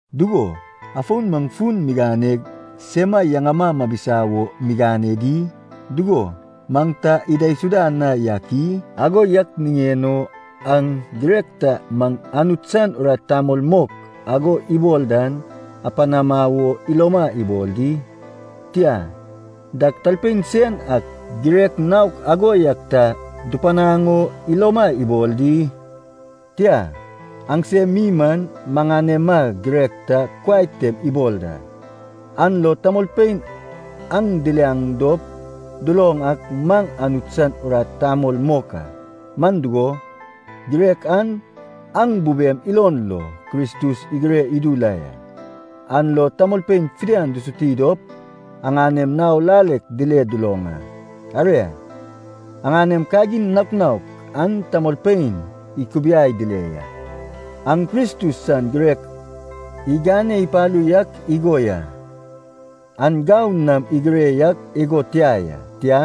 Dugo, afon maŋ fun miganeg sema yaŋama mabisa wo migane di? Dugo, maŋ ta idaisuda na yak i? Ago yak niŋen o aŋ girek ta maŋ Anut san urat tamol mok ago ibol dan apanama wo iloma ibol di? Tia, dag talpein sen ak girek naok ago yak ta dupanaŋ o iloma ibol di? Tia, aŋsem mi man, maŋanema girek ta kuai tem ibol da, an lo tamolpein aŋ diliaŋ dop duloŋ ak maŋ Anut san urat tamol mok a. Man dugo, girek an aŋ bubem ilon lo Kristus igire idu la ya, an lo tamolpein fidian dusuti dop aŋanem nao lalek dile duloŋ a. Aria, aŋanem kagin naok naok an tamolpein ikubiai dile ya, aŋ Kristus san girek igane ipalu yak igo ya. An gau nam igire yak igo tia ya, tia,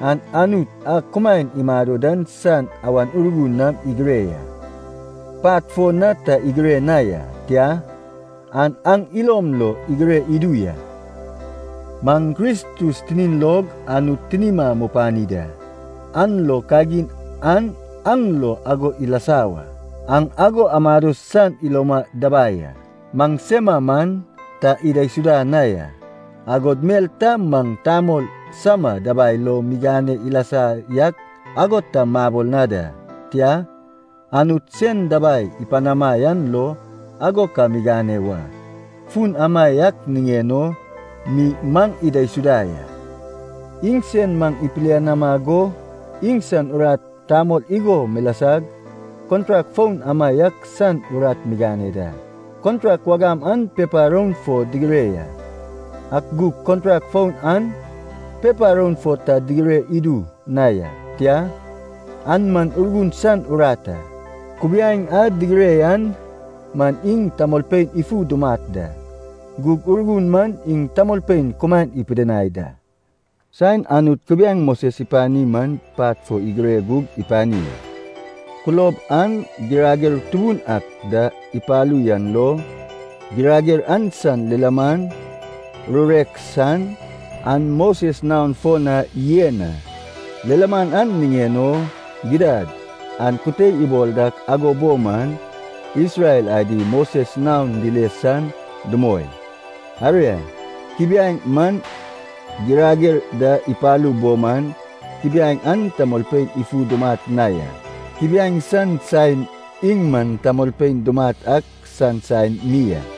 an Anut a kumaen imado dan san Awan Urgun nam igire ya. Pat fo na ta igire na ya, tia, an aŋ ilom lo igire idu ya. Maŋ Kristus tinin log Anut tinima mupani da, an lo kagin an aŋ lo ago ilasa wa. Aŋ ago amado san iloma dabai a. Maŋsema man ta idaisuda na ya, agod mel ta maŋ tamol sama dabai lo migane ilasa yak ago ta mabol na da. Tia, Anut sen dabai ipanama yan lo ago ka migane wa. Fun amaiak niŋen o mi maŋ idaisuda ya. Iŋsen maŋ ipilianama go iŋsan urat tamol igo milasag, kontrak foun amaiak san urat migane da. Kontrak wagam an pepa roun fo digire ya. Ak gug kontrak foun an pepa roun fo ta digire idu na ya. Tia, an man Urgun san urat a. Kubiaeŋ a digire yan man iŋ tamolpein ifu dumat da. Gug Urgun man iŋ tamolpein kumaen ipidinai da. Saen Anut kubiaeŋ Moses ipani man pat fo igire gug ipani a. Kulob an girager tubun ak da ipalu yan lo, girager an san lilaman, rurek san, an Moses naon fo na yen a. Lilaman an niŋen o, gidad an kute ibol dak ago bo man, Isrel adi Moses naon dile san dumoi. Aria, kubiaeŋ man girager da ipalu bo man, kubiaeŋ an tamolpein ifu dumat na ya. Kubiaeŋ san saen iŋ man tamolpein dumat ak san saen mi a.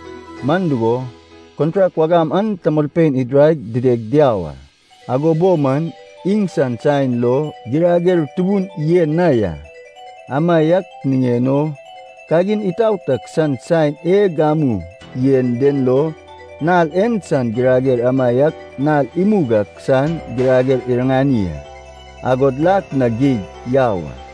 Man dugo, kontrak wagam an tamolpein idiraig dideg diau a. Ago bo man iŋsan saen lo girager tubun yen na ya. Amaiak niŋen o kagin itaot ak san saen e gamu yen den lo, nal en san girager amaiak nal imug ak san girager iriŋani a, agod lak na geig yau a.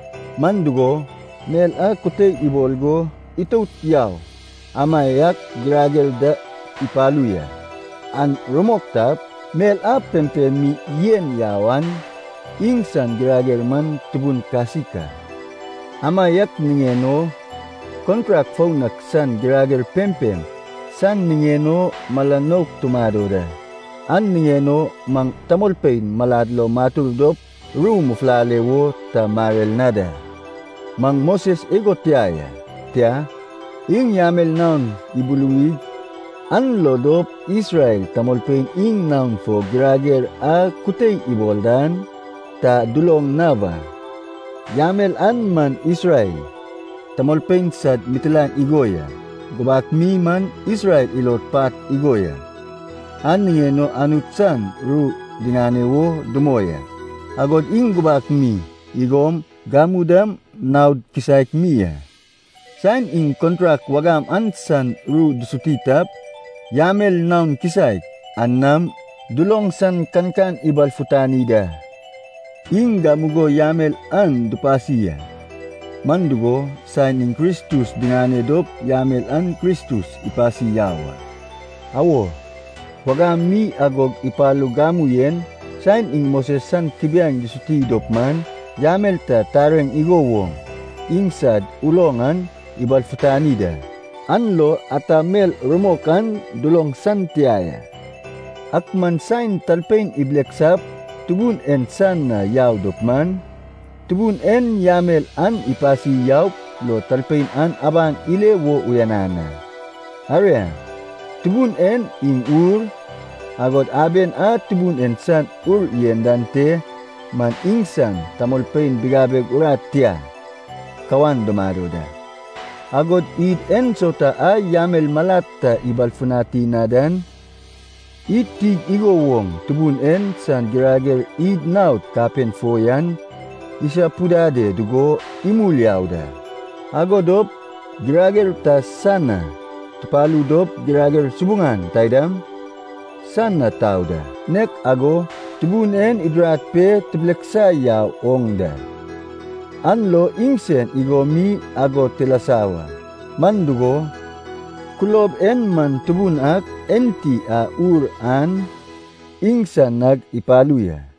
Man dugo, mel a kute ibol go itout yau amaiak girager da ipalu ya. An rumok tap, mel a pempem mi yen yau an, iŋsan girager man tubun kasik a. Amaiak niŋen o kontrak foun ak san girager pempem san niŋen o mala nouk tumado da, an niŋen o maŋ tamolpein malad lo matur dop ru mufulale wo ta marer na da. Maŋ Moses igo tia ya. Tia, iŋ yamel naon ibuluwig an lo dop Isrel tamolpein iŋ naon fo girager a kute ibol dan ta duloŋ na wa. Yamel an man Isrel tamolpein sad mitilaen igo ya. Gubak mi man Isrel ilod pat igo ya, an niŋen o Anut san ru diŋane wo dumoi a. Agod iŋ gubak mi igom gamu dam naod kisaek mi a. Saen iŋ kontrak wagam an san ru dusuti tap, yamel naon kisaek an nam duloŋ san kankan ibalfutani da. Iŋ gamugo yamel an dupasi a. Man dugo, saen iŋ Kristus diŋane dop yamel an Kristus ipasi yau a. Awo, wagam mi agog ipalug gamu en, saen iŋ Moses san kubiaeŋ dusuti dop man yamel ta tareŋ igo woŋ iŋsad uloŋ an ibalfutani da, an lo ata mel rumok an duloŋ san tia ya. Ak man saen talpein ibileksap Tubun en san na yau dop man, Tubun en yamel an ipasi yaup lo talpein an abaŋ ile wo uyanan a. Aria, Tubun en iŋ Ur, agod aben a Tubun en san Ur yen dan te man iŋsan tamolpein bigabeg urat tia kawan dumado da. Agod id ensauta a yamel malad ta ibalfutani na dan, id tig igo woŋ Tubun en san girager id naod kapen fo yan isapudade dugo imul yau da. Ago dop girager ta san na tupalu dop girager subuŋan taidam san na tau da, nek ago Tubun en idirad pe tibileksa yau oŋ da, an lo iŋsen igo mi ago tilasa wa. Man dugo, kulob en man Tubun ak enti a Ur an, iŋsan nag ipalu ya.